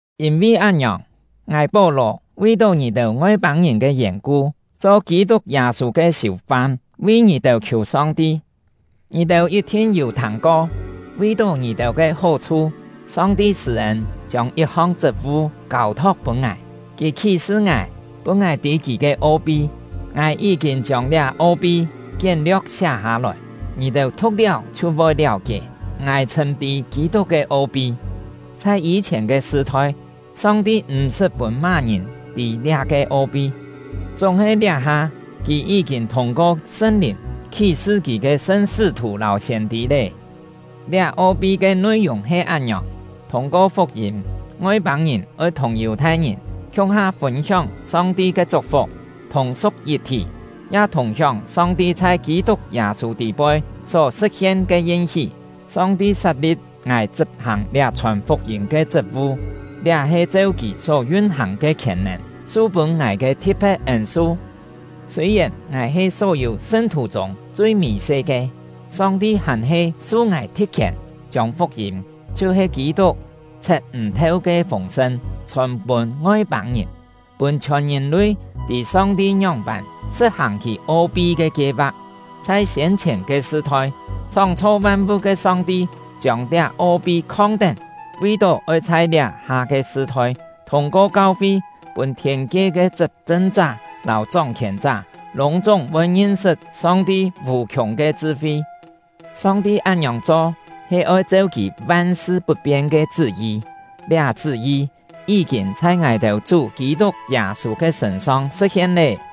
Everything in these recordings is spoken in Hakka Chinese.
Yîn-vi án-ngiòng, ngài — Pó-lò vi-tó ngì-têu Ngoi-pâng-ngìn ke yèn-ku cho Kî-tuk Yâ-sû ke siù-fam, vi ngì-têu khiù Song-ti. Ngì-têu yit-thin yû thâng-ko, vi-tó ngì-têu ke hó-chhu, Song-ti sṳ̂-ên chiông yit-hong chṳt-vu kâu-thok pûn ngài. Kì khí-sṳ ngài, pûn ngài tî Kì ke o-pi. (Ngài yí-kîn chiông liá o-pi kién-lio̍k siá hâ-lòi; ngì-têu thu̍k-liáu chhiu voi liáu-kié, ngài chhṳ̂m tî Kî-tuk ke o-pi.) Chhai yî-chhièn ke sṳ-thoi, Song-ti m̀-sṳt pûn má-ngìn tî liá-ke o-pi; chúng-he liá-ha, Kì yí-kîn thûng-ko Sṳn-Lìn khí-sṳ Kì ke sṳn sṳ́-thù lâu siên-tî lé. Liá o-pi ke nui-yùng he án-ngiòng: Thûng-ko fuk-yîm, Ngoi-pâng-ngìn oi thùng Yù-thai-ngìn khiung-ha fûn-hióng Song-ti ke chuk-fuk, thùng-su̍k yit-thí, ya thùng-hióng Song-ti chhai Kî-tuk Yâ-sû tî-poi só sṳ̍t-hien ke yin-hí. Song-ti sat-li̍p ngài chṳp-hàng liá chhòn fuk-yîm ke chṳt-vu; liá he cheu Kì só yun-hàng ke khièn-nèn su-pûn ngài ke thi̍t-phe̍t ên-su. Sûi-yèn ngài he só-yû sṳn-thù chûng chui mì-se ke, Song-ti hàn-he su ngài thi̍t-khièn, chiông fuk-yîm, chhiu-he Kî-tuk chhet m̀-theu ke fûng-sṳn, chhòn-pûn Ngoi-pâng-ngìn, pûn chhiòn ngìn-lui tî Song-ti ngióng-pân sṳ̍t-hàng Kì o-pi ke kie-va̍k. Chhai siên-chhièn ke sṳ-thoi, chhóng-chho van-vu̍t ke Song-ti chiông liá o-pi khong-tén, vi-tó oi chhai liá-ha ke sṳ-thoi, thûng-ko kau-fi, pûn thiên-kie ke chṳp-chṳn-chá lâu chóng-khièn-chá lûng-chúng voi ngin-sṳt Song-ti vù-khiùng ke chṳ-fi. Song-ti án-ngiòng cho he cheu Kì van-sṳ put-pien ke chṳ́-yi; liá chṳ́-yi yí-kîn chhai ngài-têu Chú Kî-tuk Yâ-sû ke sṳ̂n-song sṳ̍t-hien lé.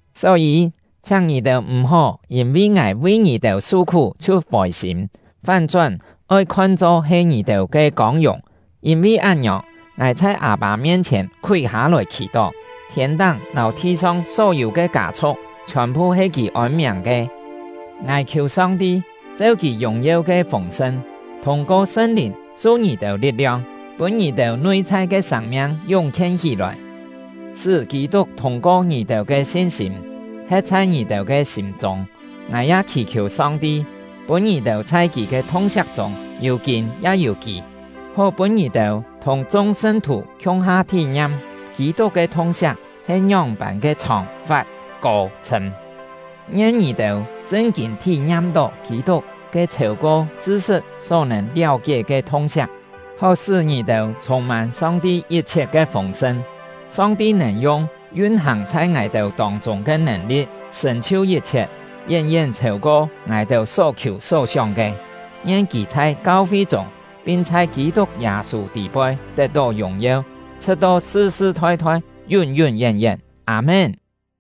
Só-yî, chhiáng ngì-têu m̀-hó yîn-vi ngài vi ngì-têu su-khú chhiu fôi-sîm, fán-chón oi khon-cho he ngì-têu ke kông-yùng. Yîn-vi án-ngiòng, ngài chhai Â-pâ mien-chhièn khúi hâ-lòi khì-tó. Thiên-táng lâu thi-song só-yû ke kâ-chhu̍k chhiòn-phu he Kì ôn-miàng ke. Ngài khiù Song-ti, cheu Kì yùng-yeu ke fûng-sṳn, thûng-ko Sṳn-Lìn su ngì-têu li̍t-liong, pûn ngì-têu nui-chhai ke sâng-miang yúng-khien hí-lòi, sṳ́ Kî-tuk thûng-ko ngì-têu ke sin-sîm, he̍t chhai ngì-têu ke sîm-chûng. Ngài ya khì-khiù Song-ti, pûn ngì-têu chhai kì ke thung-siak chûng yû kîn ya yû kî, hó pûn ngì-têu thùng chung sṳn-thù khiung-ha thí-ngiam Kî-tuk ke thung-siak he ngióng-pân ke chhòng, fat, kô, chhṳ̂m. Ngien ngì-têu chṳn-kîn thí-ngiam-tó Kî-tuk ke chhêu-ko chṳ-sṳt só nèn liáu-kié ke thung-siak, hó sṳ́ ngì-têu chhûng-mân Song-ti yit-chhiet ke fûng-sṳn. Song-ti nèn yung yun-hàng chhai ngài-têu tông-chûng ke nèn-li̍t sṳ̀n-chhiu yit-chhiet, yén-yén chhêu-ko ngài-têu só khiù só sióng ke. Ngien Kì chhai kau-fi chûng pin chhai Kî-tuk Yâ-sû tî-poi tet-tó yùng-yeu, chhṳ̍t-to sṳ-sṳ thoi-thoi, yún-yún yén-yén! Â-mén.